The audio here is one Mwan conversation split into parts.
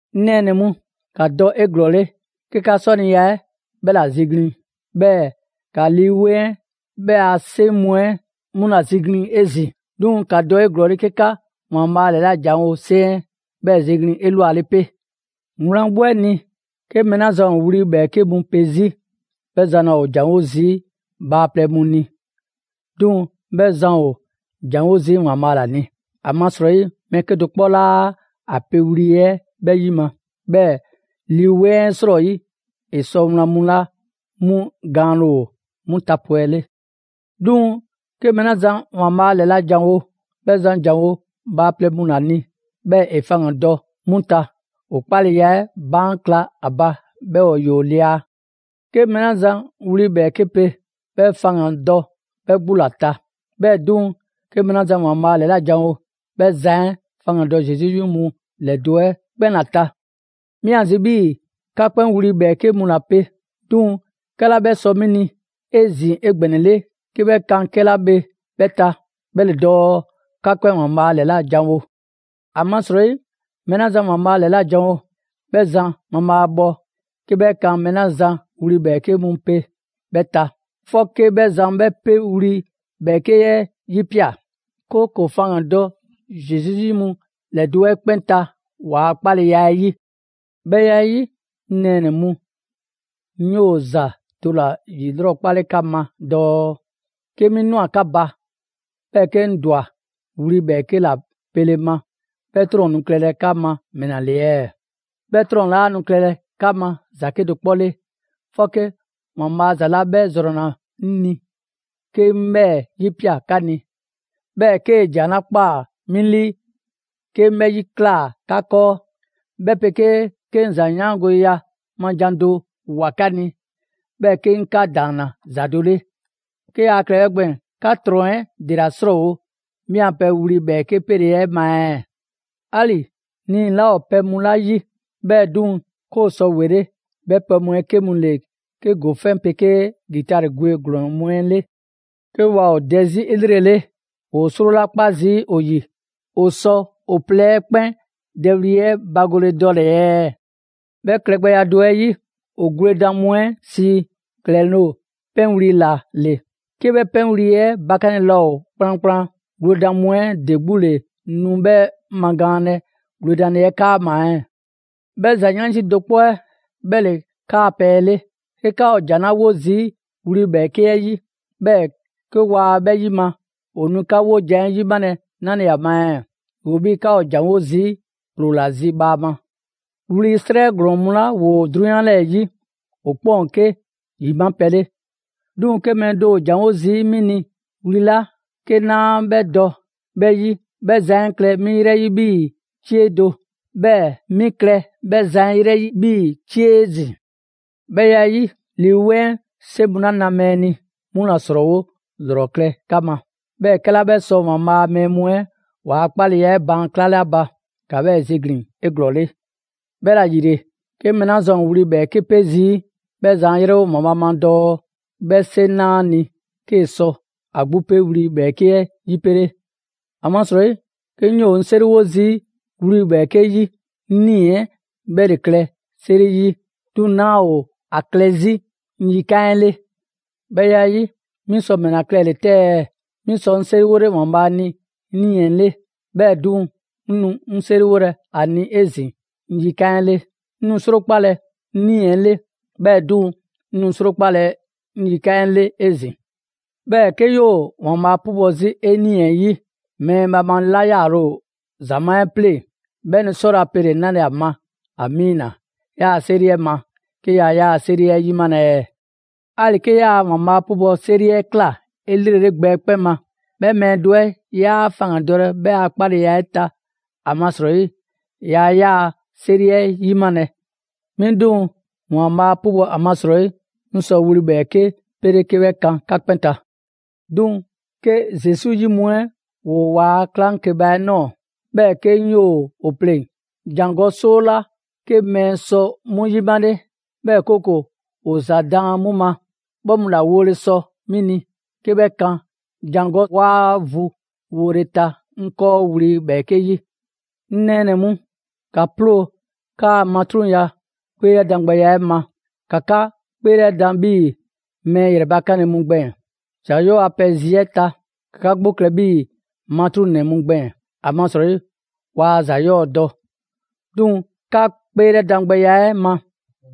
'Ŋ nɛɛnɛ‑ mu, ‑ka dɔ 'eglɔɔle 'ke 'ka 'sɔniya 'ɛ 'bhɛ ‑la ziglin‑. 'Bhɛɛ‑ ‑ka Lii 'Weŋ 'ɛ 'bhɛ a 'seŋ mu 'ɛ 'mu ‑la ziglin‑ 'ezin‑; 'duŋ‑ ‑ka dɔ 'eglɔɔle 'ke 'ka ‑Waanbhaa' ‑lɛlajanwole 'seŋ 'ɛ 'bhɛɛ‑ ziglin‑ 'elwale 'pe. Wlan 'gbu 'ɛ ni, 'ke mɛɛ 'la zan ‑o wli ‑bhɛɛke' mu pe 'zi, 'bhɛ zan laa ‑o ‑janwo' zii' bhaaplɛŋ mu ni, 'duŋ‑ 'bhɛ zan ‑o ‑janwo' zii' ‑Waanbhaa' ‑la ni. ‑Amasrɔyi mɛɛ 'kedo‑ 'kpɔ 'laa ‑a pewli 'ɛ 'bhɛ 'yima‑, 'bhɛɛ‑ Lii 'Weŋ 'ɛ 'srɔyi, ‑e sɔ wlan mu 'la 'mu gaanle ‑o 'mu tapwɛle. 'Duŋ‑ 'ke mɛɛ 'la zan ‑Waanbhaa' ‑lɛlajanwo, 'bhɛ zan ‑janwo' bhaaplɛŋ mu ‑la ni, 'bhɛɛ‑ ‑e faŋgandɔ 'mu ta, ‑o 'kpaleya 'ɛ baan' kla ‑a ba, 'bhɛɛ‑ ‑yoo lia. 'Ke mɛɛ 'la zan wli ‑bhɛɛke' pe, 'bhɛ zan faŋgandɔ 'bhɛ 'gbu ‑la ta. 'Bhɛɛ‑ 'duŋ‑, 'ke mɛɛ 'la zan ‑Waanbhaa' ‑lɛlajanwo, 'bhɛ zan 'ɛ faŋgandɔ Zesu 'yi mu ‑lɛdo' 'ɛ 'kpɛn ‑la ta. 'Mi ‑a zi 'bhii‑ 'ka 'kpɛn wli ‑bhɛɛke' mu ‑la pe; 'duŋ‑ 'kɛla 'bhɛ sɔ 'mi ni 'ezin‑ 'egbɛnɛle 'ke 'bhɛ kan 'kɛla bhe 'bhɛ ta, 'bhɛ ‑le dɔɔ 'ka 'kpɛn ‑Waanbhaa' 'lɛlajanwo. ‑Amasrɔyi mɛɛ 'la zan ‑Waanbhaa' ‑lɛlajanwo, 'bhɛ mabhaabhɔ 'ke 'bhɛ kan mɛɛ 'la zan wli ‑bhɛɛke' mu pe 'bhɛ ta; 'fɔke 'bhɛ zan 'bhɛ 'pe wli ‑bhɛɛke' 'ɛ 'yipia꞊, 'kooko‑ faŋgan‑ dɔ Zesu 'yi mu ‑lɛdo' 'ɛ 'kpɛn ta ‑waa' 'kpaleya 'ɛ 'yi. 'Bhɛ ya 'ɛ 'yi, 'ŋ nɛɛnɛ‑ mu, 'ŋ 'yoo ‑za do ‑la ‑yilrɔkpale 'ka ma dɔɔ: 'Ke 'mi ꞊nwa 'ka ba, 'bhɛɛ‑ 'ke 'ŋ ꞊dwa wli ‑bhɛɛke' ‑la pele ma, 'bhɛ 'trɔn‑ nu klɛlɛ 'ka ma ‑mɛla ‑le ɛɛ? 'Bhɛ 'trɔn‑ 'laa nu klɛlɛ 'ka ma ‑za 'kedo‑ 'kpɔ 'le, 'fɔke ‑Waanbhaa' ‑za 'la 'bhɛ ‑zrɔnna 'ŋ ni 'ke 'ŋ 'bhɛɛ‑ 'yipia꞊ 'ka ni, 'bhɛɛ‑ 'kee‑ ‑jan 'la ꞊kpaa 'mi 'lii 'ke 'ŋ 'bhɛ 'yiklaa꞊ 'ka 'kɔɔ, 'bhɛ 'pegee 'ke 'ŋ ‑za 'yaangoleya ma ‑jan do ꞊woa 'ka ni, 'bhɛɛ‑ 'ke 'ŋ 'ka ‑daanna ‑za do 'le. 'Ke yaa klɛlɛ 'bhɛ gbɛɛn‑, 'ka nu ‑trɔn 'ɛ ‑dela ‑srɔɔwolɛ 'mi a pɛ wli ‑bhɛɛke' pele 'ɛ ma ɛɛ? 'Ali‑ nii‑ 'laa ‑o pɛ mu 'la 'yi, 'bhɛɛ‑ 'duŋ‑ 'ke ‑o sɔ ‑wele', 'bhɛ pɛ mu 'ɛ 'ke mu ‑le 'ke ‑gofɛn' 'pegee ‑gitari gwe ‑glɔɔn mu 'ɛ 'le. 'Ke waa ‑o dɛ 'zi 'elrele, ‑woo 'sro 'la 'kpa zii' ‑o ‑yi, ‑o sɔ ‑o plɛ 'ɛ 'kpɛn dɛwli 'ɛ bagole dɔle‑ ɛɛ? 'Bhɛ klɛgbɛya do 'ɛ 'yi, ‑o gwledan mu 'ɛ sii ‑klɛloŋ' 'pɛnwli‑ 'la 'le, 'ke 'bhɛ 'pɛnwli‑ 'ɛ bakanle laa ‑o kplankplan, gwledan mu 'ɛ ‑de 'gbu ‑le nu 'bhɛ magaanlɛ gwledanle 'ɛ 'kaama‑ ɛɛ? 'Bhɛ ‑za 'yansi do 'kpɔ 'ɛ 'bhɛ ‑le 'kaa‑ pɛ 'ɛ 'le. 'Ke 'ka ‑o ‑jan 'la 'wo zii' wli ‑bhɛɛke' 'ɛ 'yi, 'bhɛɛ‑ 'ke waa 'bhɛ 'yima‑, ‑o nu 'ka 'wojan‑ 'ɛ 'yimalɛ 'nale‑ ‑a ma ɛɛ? ‑Yoo 'bhii‑ 'ka ‑o ‑janwo' zii' ‑ploo ‑la zi bhaama. Wli 'srɛ ‑glɔɔn mu 'la ‑woo 'drunyan 'lɛɛ‑ 'yi, ‑o 'kpɛn ‑o 'ke ‑yima' pɛ 'le. 'Duŋ‑ 'ke mɛɛ do ‑o ‑janwo' zii' 'mi ni wli 'la 'ke 'naa 'bhɛ dɔ 'bhɛ 'yi, 'bhɛ zan 'ɛ klɛ 'mi 'yrɛ 'yi 'bhii‑ 'cie do; 'bhɛɛ‑ 'mi klɛ 'bhɛ zan 'ɛ 'yrɛ 'yi 'bhii‑ 'cie 'ezin‑. 'Bhɛ ya 'ɛ 'yi, Lii 'Weŋ 'ɛ 'seŋ mu 'la na mɛɛ ni, 'mu ‑la ‑srɔɔwo' ‑lrɔ klɛ 'ka ma, 'bhɛɛ‑ 'kɛla 'bhɛ sɔ ‑Waanbhaa' a mɛɛ mu 'ɛ ‑waa' 'kpaleya 'ɛ baan' 'klale ‑a ba, ‑ka 'bhɛɛ‑ ziglin‑ 'eglɔɔle. 'Bhɛla‑ ‑yile, 'ke mɛɛ 'la zan ‑o wli ‑bhɛɛke' pe zii', 'bhɛ zan 'a 'yrɛwo ‑Waanbhaa' ma dɔɔ 'bhɛ 'seŋ 'na ‑a ni 'kee‑ sɔ ‑a 'gbu 'pe wli ‑bhɛɛke' 'ɛ 'yipele. ‑Amasrɔyi 'ke 'ŋ 'yoo‑ 'ŋ 'seriwo zii' wli ‑bhɛɛke' 'yi, 'ŋ nii‑ 'ɛ 'bhɛ ‑le klɛ 'seri 'yi, 'duŋ‑ 'naa ‑o ‑a klɛ 'zi 'ŋ yikan' 'ɛ 'le. 'Bhɛ ya 'ɛ 'yi, 'mi sɔ ‑mɛla klɛle‑ 'tɛ ɛɛ? 'Mi sɔ 'ŋ 'seriwole ‑Waanbhaa' ni 'ŋ 'nii‑ 'ɛ 'le; 'bhɛɛ‑ 'duŋ‑, 'ŋ nu 'seriwolɛ ‑a ni 'ezin‑ 'ŋ yikan 'ɛ 'le. 'Ŋ nu 'srokpalɛ 'ŋ 'nii‑ 'ɛ 'le; 'bhɛɛ‑ 'duŋ‑, 'ŋ nu 'srokpalɛ 'ŋ yikan' 'ɛ 'le 'ezin‑. 'Bhɛɛ‑ 'ke 'yoo‑ ‑Waanbhaa' 'pubɔ‑ 'zi 'e 'nii‑ 'ɛ 'yi, mɛɛ bhaamale 'la 'yaale‑ ‑o ‑zamaa' 'ɛ 'pleŋ‑, 'bhɛ nu 'sɔlɛ‑ ‑a pele‑ 'nale‑ ‑a ma «Amiina» 'yaa‑ 'seri 'ɛ ma, 'ke yaa 'yaa‑ 'seri 'ɛ 'yimalɛ ɛɛ? 'Ali‑ 'ke 'yaa‑ ‑Waanbhaa' 'pubɔ‑ 'seri 'ɛ ꞊kla 'elrele gbɛ 'ɛ 'kpɛn ma, 'bhɛ mɛɛ do 'ɛ, 'yaa faŋgandɔlɛ 'bhɛ a 'kpaleya 'ɛ ta; ‑amasrɔyi yaa 'yaa‑ 'seri 'ɛ 'yimalɛ. 'Mi 'duŋ‑, ‑Waanbhaa' 'pubɔ‑ ‑amasrɔyi, 'ŋ sɔ wli ‑bhɛɛke' 'pele 'kee‑ kan 'ka 'kpɛn ta. 'Duŋ‑ 'ke Zesu 'yi mu 'ɛ ‑woo ‑waa' 'klaŋkeba ꞊nɔɔ, 'bhɛɛ‑ 'ke 'ŋ 'yoo‑ ‑o 'pleŋ‑, ‑jangɔ' 'soo 'la 'ke mɛɛ mu sɔ 'mu ‑yimale, 'bhɛɛ‑ 'kooko‑ ‑o ‑za daan 'mu ma, 'bhɛ mu ‑la wole sɔ 'mi ni 'ke 'bhɛ kan ‑jangɔ' 'waa vu wole ta 'ŋ 'kɔɔ wli ‑bhɛɛke' 'yi. 'Ŋ nɛɛnɛ‑ mu, ‑ka 'ploo‑ 'kaa‑ matruŋya 'kpeelɛdan gbɛya 'ɛ ma, ‑ka 'ka 'kpeelɛdan 'bhii‑ mɛɛ ‑yrɛbakanle mu gbɛɛn‑. ‑Za 'yɔɔ‑ a pɛ zi 'ɛ ta, ‑ka 'ka 'gbu klɛ 'bhii‑ matruŋnɛ mu gbɛɛn‑, ‑amasrɔyi waa ‑za 'yɔɔ‑ dɔ. 'Duŋ‑ 'ka 'kpeelɛdan gbɛya 'ɛ ma,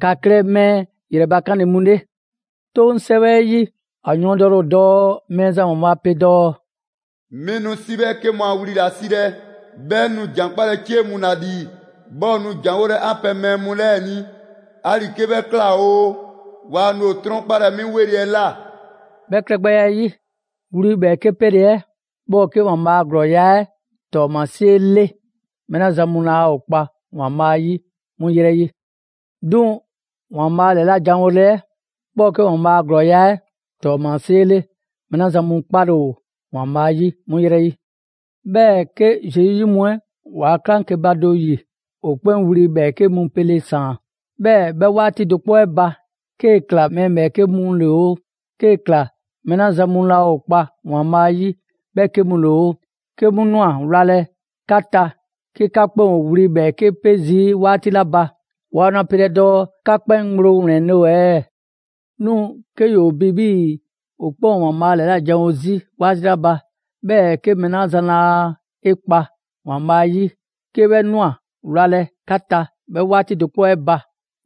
‑ka klɛ mɛɛ ‑yrɛbakanle mu 'le. 'Toŋ 'sɛwɛ 'ɛ 'yi, ‑a yɔɔndɛle ‑o dɔɔ Mɛɛzan ‑Waanbhaa' pe dɔɔ: «'Mi nu 'si 'bhɛɛke mu a wli ‑la 'silɛ‑, 'bhɛɛ‑ 'ŋ nu ‑jan 'kpalɛ‑ 'cie mu ‑la ‑lii, 'bhɛɛ‑ ‑o nu ‑janwolɛ 'an pɛ mɛɛ mu 'lɛɛ‑ ni, 'ali‑ 'ke 'bhɛ ꞊kla oo, waa nu ‑o 'trɔnkpalɛ 'mi 'weli‑ 'ɛ ꞊la.» 'Bhɛ klɛgbɛya 'ɛ 'yi, wli ‑bhɛɛke' pele 'ɛ, 'bhɛ ‑o 'ke ‑Waanbhaa' a ‑glɔɔya' 'ɛ ‑tɔɔmasie 'le mɛɛ 'la zan mu laa ‑o kpa ‑Waanbhaa' 'yi 'mu yrɛ 'yi; 'duŋ‑ ‑Waanbhaa' ‑lɛlajanwole 'ɛ, 'bhɛ ‑o 'ke ‑Waanbhaa' a ‑glɔɔya' 'ɛ ‑tɔɔmasie 'le mɛɛ 'la zan mu 'kpale‑ ‑o ‑Waanbhaa' 'yi 'mu 'yrɛ 'yi. 'Bhɛɛ‑ 'ke Zesu 'yi mu 'ɛ ‑waa' 'klaŋkeba do ‑yi, ‑o 'kpɛn wli ‑bhɛɛke' mu 'pele‑ ‑saan; 'bhɛɛ‑ 'bhɛ 'waati do 'kpɔ 'ɛ ba, 'kee‑ ꞊kla mɛɛ ‑bhɛɛke' mu 'le oo, 'kee‑ ꞊kla mɛɛ 'la zan mu laa ‑o kpa ‑Waanbhaa' ‑yi 'bhɛ 'ke mu 'le oo, 'ke 'mu ꞊nwa wlalɛ 'ka ta 'ke 'ka 'kpɛn ‑o wli ‑bhɛɛke' 'pe zii' 'waati 'la ba; waa nu ‑a pelɛ dɔɔ 'ka 'kpɛn ŋgblo ‑wlɛnle' ‑o ɛɛ? 'Duŋ‑ 'ke ‑yoo bi 'bhii‑ ‑o 'kpɛn ‑o ‑Waanbhaa' ‑lɛlajanwo 'zi 'waati 'la ba, 'bhɛɛ‑ 'ke mɛɛ 'la zan laa 'e 'kpa ‑Waanbhaa' 'yi, 'ke 'bhɛ ꞊nwa wlalɛ 'ka ta 'bhɛ 'waati do 'kpɔ 'ɛ ba;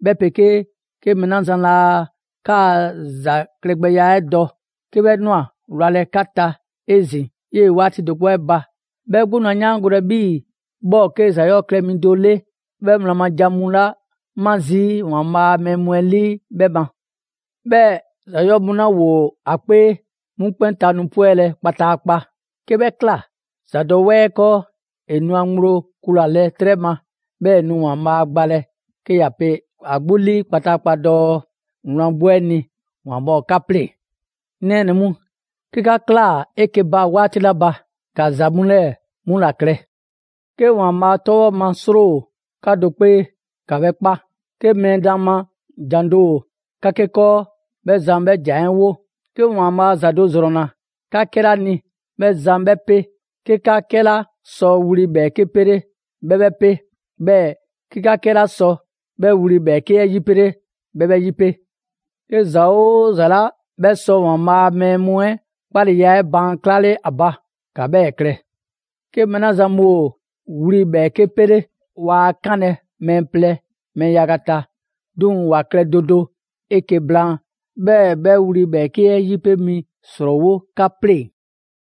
'bhɛ 'pegee 'ke mɛɛ 'la zan laa 'kaa‑ ‑za klɛgbɛya 'ɛ dɔ, 'ke 'bhɛ ꞊nwa wlalɛ 'ka ta 'ezin‑ 'yee‑ 'waati do 'kpɔ 'ɛ ba, 'bhɛ 'gbu nu ‑a 'yaangolɛ 'bhii‑ 'bhɛ ‑o 'ke ‑za 'yɔɔ‑ klɛ mi do 'le 'bhɛ wlan ma ‑jan mu 'la 'ma zii' ‑Waanbhaa' a mɛɛ mu 'ɛ 'lii 'bhɛ ma. 'Bhɛɛ‑ ‑za 'yɔɔ‑ mu 'la ‑woo ‑a 'kpee, 'mu 'kpɛn ta nu 'pwɛlɛ‑ kpataakpa. 'Ke 'bhɛ ꞊kla, ‑zadɔwɛɛ 'ɛ 'kɔɔ, ‑e nu ‑a ŋgblo kulalɛ 'trɛ ma; 'bhɛɛ‑ ‑e nu ‑Waanbhaa' gbalɛ 'ke ‑ya pe ‑a 'gbu 'lii kpataakpa dɔɔ: «Wlan 'gbu 'ɛ ni, ‑Waanbhaa' ‑o 'ka 'pleŋ‑!» 'Ŋ nɛɛnɛ‑ mu, 'ke 'ka ꞊klaa 'eke‑ ba 'waati 'la ba, ‑ka ‑za mu 'lɛɛ‑ 'mu ‑la klɛ: 'Ke ‑Waanbhaa' 'tɔbhɔ ma 'sro ‑o 'ka do 'kpee, ‑ka 'bhɛ 'kpa; 'ke mɛɛ daan ma ‑jan do ‑o 'ka 'ke 'kɔɔ, 'bhɛ zan 'bhɛ ‑jan 'ɛ 'wo; 'ke ‑Waanbhaa' ‑za do ‑zrɔnna 'ka 'kɛla ni, 'bhɛ zan 'bhɛ 'pe; 'ke 'ka 'kɛla sɔ wli ‑bhɛɛke' pele‑, 'bhɛ 'bhɛ 'pe; 'bhɛɛ‑ 'ke 'ka 'kɛla sɔ 'bhɛ wli ‑bhɛɛke' 'ɛ 'yipele, 'bhɛ 'bhɛ 'yipe. 'Ke ‑za 'oo ‑za 'la 'bhɛ sɔ ‑Waanbhaa' a mɛɛ mu 'ɛ 'kpaleya 'ɛ baan' 'klale ‑a ba, ‑ka 'bhɛɛ‑ klɛ. 'Ke mɛɛ 'la zan mu ‑o wli 'pele, waa 'kanlɛ‑ mɛɛ plɛ, mɛɛ yaga ta; 'duŋ‑ ‑wa klɛ do do 'eke‑ blaan, 'bhɛɛ‑ 'bhɛ wli ‑bhɛɛke' 'ɛ 'yipe mi 'ɛ ‑srɔɔwo' 'ka 'pleŋ‑.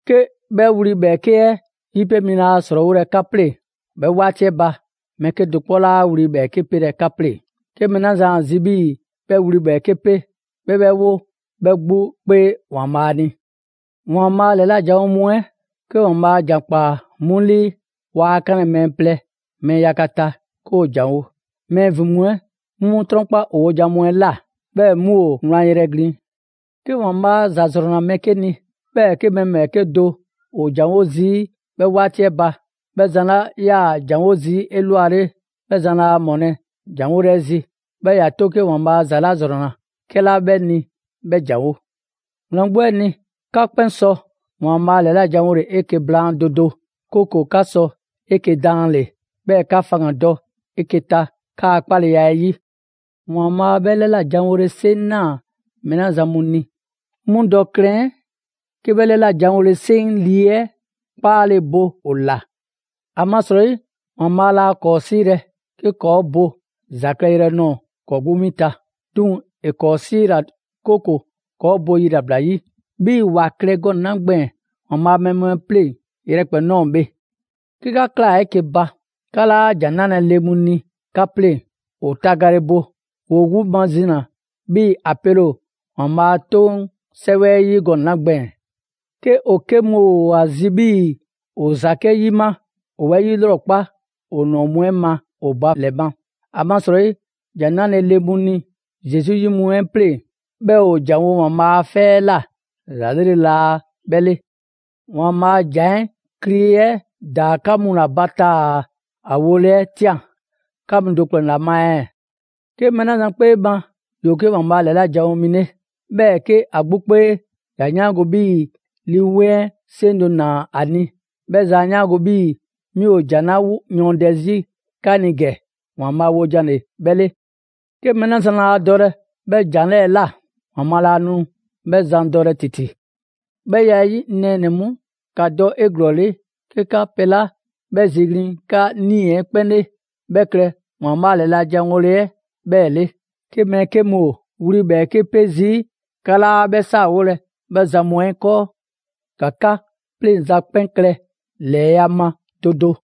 'Ke 'bhɛ wli ‑bhɛɛke' 'ɛ 'yipe mi laa ‑srɔɔwolɛ 'ka 'pleŋ‑, 'bhɛ 'waati 'ɛ ba, mɛɛ 'kedo‑ 'kpɔ 'laa wli ‑bhɛɛke' pelɛ 'ka 'pleŋ‑. 'Ke mɛɛ 'la zan ‑a zi 'bhii‑ 'bhɛ wli ‑bhɛɛke' pe, 'bhɛ 'bhɛ 'wo 'bhɛ 'gbu 'kpee ‑Waanbhaa' ni. ‑Waanbhaa' ‑lɛla' janwo mu 'ɛ, 'ke ‑Waanbhaa' ‑jan ‑kpaa 'mu 'lii, waa 'kanlɛ‑ mɛɛ plɛ, mɛɛ yaga ta 'ke ‑o ‑janwo'; mɛɛ ‑vin mu 'ɛ 'mu 'mu 'trɔnkpa ‑o wojan mu 'ɛ ꞊la, 'bhɛɛ‑ 'mu ‑o wlan yrɛ glin. 'Ke ‑Waanbhaa' ‑za ‑zrɔnna mɛɛ 'ke ni, 'bhɛɛ‑ 'ke mɛɛ ‑bhɛɛke' do ‑o ‑janwo' zii' 'bhɛ 'waati 'ɛ ba, mɛɛ 'la zan ‑yaa ‑janwo' zii' 'elwale, 'bhɛ 'laa 'mɔlɛ‑ ‑janwole 'ɛ zi, 'bhɛɛ‑ ‑ya 'to 'ke ‑Waanbhaa' ‑za ‑zrɔnna 'kɛla 'bhɛ ni 'bhɛ ‑janwo'. Wlan 'gbu 'ɛ ni, 'ka 'kpɛn sɔ ‑Waanbhaa' ‑lɛlajanwole 'eke‑ blaan do do; 'kooko‑ 'ka sɔ 'eke‑ daanle‑, 'bhɛɛ‑ 'ka faŋgandɔ 'eke‑ ta 'kaa‑ 'kpaleya 'ɛ 'yi. ‑Waanbhaa' 'bhɛ ‑lɛlajanwole 'seŋ 'naa‑ mɛɛ 'la zan mu ni, 'mu dɔ klɛn 'ke 'bhɛ ‑lɛlajanwole 'seŋ Lii 'ɛ 'kpaale‑ bo ‑o ‑la. ‑Amasrɔyi ‑Waanbhaa' laa ‑kɔɔ' 'siilɛ‑ 'ke ‑kɔɔ' bo ‑za klɛyrɛ nɔɔ‑ 'kɔɔ‑ 'gbu 'win ta, 'duŋ‑ ‑e 'kɔɔ‑ 'siila‑, 'kooko‑ 'kɔɔ‑ bo yilabla 'yi. 'Bhii‑ ‑wa klɛ gɔnɛ‑ 'la gbɛɛn‑ ‑Waanbhaa' a mɛɛ mu 'pleŋ‑ yrɛkpɛn‑ ꞊nɔɔ bhe. 'Ke 'ka ꞊klaa 'eke‑ ba, 'ka 'laa ‑jan 'nalɛ‑ le mu ni 'ka 'pleŋ‑, ‑o tagale bo. ‑Woo 'gbu mazina 'bhii‑ ‑a pele ‑o ‑Waanbhaa' a 'Toŋ 'Sɛwɛ 'ɛ 'yi gɔnɛ‑ 'la gbɛɛn‑. 'Ke ‑o 'ke mu ‑o ‑a zi 'bhii‑ ‑o ‑za 'ke 'yima, ‑o 'bhɛ 'yilrɔkpa ‑o ‑nɔɔ mu 'ɛ ma ‑o ba ‑lɛ ma. ‑Amasrɔyi ‑jan 'nale‑ le mu ni Zesu 'yi mu 'ɛ 'pleŋ‑, 'bhɛɛ‑ ‑o ‑janwo' ‑Waanbhaa' a 'fɛ 'ɛ ꞊la, ‑za 'lrele‑ laa 'bhɛ 'le. ‑Waanbhaa' a ‑jan 'ɛ kli 'ɛ ‑daa 'ka mu ‑la ba taa‑ ‑a wole 'ɛ ꞊tian 'ka mu do ‑kplɛn ‑la ma ɛɛ? 'Ke mɛɛ 'la zan 'kpee ma ‑yoo 'ke ‑Waanbhaa' ‑lɛla' janwo mi 'le, 'bhɛɛ‑ 'ke ‑a 'gbu 'kpee ‑ya 'yaango‑ 'bhii‑ Lii 'Weŋ 'ɛ 'seŋ do ‑naa ‑a ni, 'bhɛ zan 'a 'yaango‑ 'bhii‑ 'mi ‑o ‑jan 'la yɔɔndɛ 'zi 'ka ni ‑gɛ, ‑Waanbhaa' wojan ‑le 'bhɛ 'le. 'Ke 'bhɛ zan laa dɔlɛ 'bhɛ ‑jan 'lɛɛ‑ ꞊la, ‑Waanbhaa' laa nu 'bhɛ zan dɔlɛ ‑titi. 'Bhɛ ya 'ɛ 'yi, 'ŋ nɛɛnɛ‑ mu, ‑ka dɔ 'eglɔɔle 'ke 'ka pɛ 'la 'bhɛ ziglin‑ 'ka 'nii‑ 'ɛ 'kpɛn 'le, 'bhɛ klɛ ‑Waanbhaa' ‑lɛlajanwole 'ɛ 'bhɛɛ‑ 'le. 'Ke mɛɛ 'ke mu ‑o wli ‑bhɛɛke' 'pe zii', 'ka 'laa 'bhɛ 'saawolɛ 'bhɛ zan mu 'ɛ 'kɔɔ. ‑Ka 'ka 'pleŋza‑ 'kpɛn klɛ ‑lɛɛya' ma do do.